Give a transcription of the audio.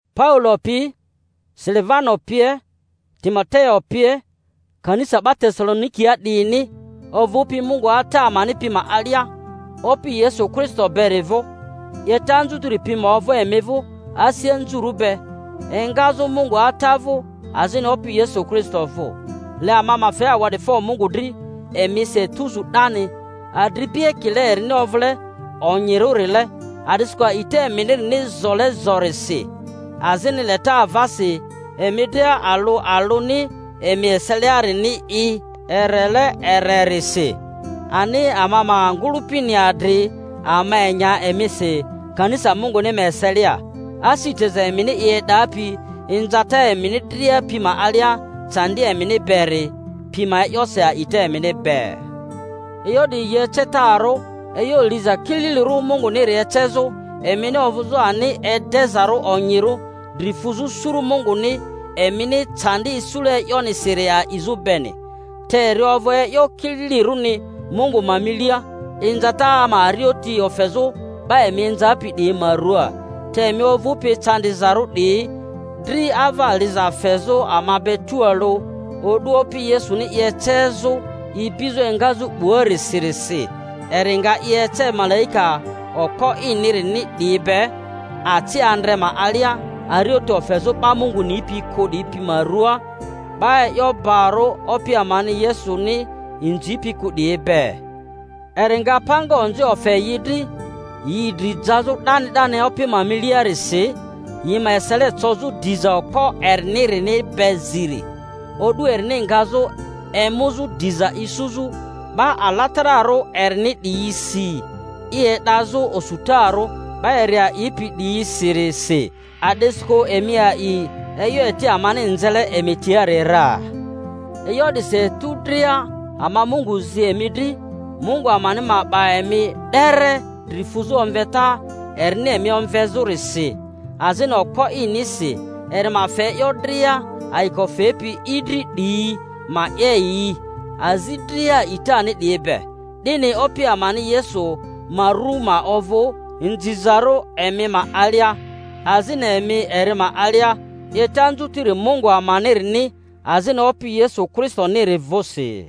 Paulo pi, Silivano pie, Timoteo pie, Kanisa 'ba Tesalonikia 'diyini, ovᴜpi Mungu Ata amani pi ma alia Opi Yesu Kristo beri vᴜ: 'Yeta anzutiri pi ma ovᴜ emi vᴜ asi anzurᴜ be engazᴜ Mungu Ata vᴜ azini Opi Yesu Kristo vᴜ. Le ama ma fe awa'difo Mungu dri emisi etuzu 'dani, adripi, ekile erini ovᴜle onyirᴜrile, a'disikᴜ a'ita eminini zole zorisi, azini leta avasi emi dria alᴜ alᴜni emi eseliarini i. erele ererisi; ani ama ma ngᴜlᴜpini adri ama enya emisi kanisa Munguni ma eselia, asi teza emini i e'dapi inzata emini dria pi ma alia candi emini beri pi ma e'yosi a'ita emini be. E'yo 'diyi yi ecetarᴜ e'yo liza kililirᴜ Munguniri ecezᴜ, emini ovᴜzᴜ ani edezarᴜ onyirᴜ dri fᴜzᴜ suru Munguni emini candi isule e'yonisiri a'izᴜ beni. Te eri ovᴜ e'yo kililirᴜni Mungu ma milia inzata ma arioti ofezᴜ 'ba emi inzapi 'diyi ma ruaa, te emi ovᴜpi ecandizarᴜ 'diyi dri ava liza fezᴜ ama be tualᴜ, o'du Opi Yesuni i ecezᴜ ibizᴜ engazᴜ 'buarisirisi; eri nga i ece malaika okpo inirini 'diyi be aci andre ma alia, arioti ofezᴜ 'ba Mungu nipi kᴜ 'diyi ma ruaa, 'ba e'yo barᴜ Opi amani Yesuni inzipi kᴜ 'diyi be. Eri nga panga onzi ofe yi dri, yi dri jazᴜ 'dani 'dani Opi ma milia-risi, yi ma esele cozᴜ diza okpo erini-rini be ziri, o'du erini ngazᴜ emu-zᴜ diza isuzᴜ 'ba alatararᴜ erini 'diyi-si, i e'dazᴜ osutarᴜ 'ba eri a'ipi 'diyisi-risi, a'disikᴜ emi a'i e'yo eti amani nzele emi tiari ra. E'yo 'disi etu dria ama Mungu zi emi dri, Mungu amani ma 'ba emi 'dere dri fᴜzᴜ omveta erini emi omvezᴜrisi, azini okpo inisi eri ma fe e'yo dria ayiko fepi i dri 'diyi ma 'ye yi, azi dria a'itani 'diyi be, 'dini Opi amani Yesu ma ru ma ovᴜ inzizarᴜ emi ma alia, azini emi eri ma alia, 'yeta anzutiri Mungu amanini azini Opi Yesu Kristoniri vᴜsi.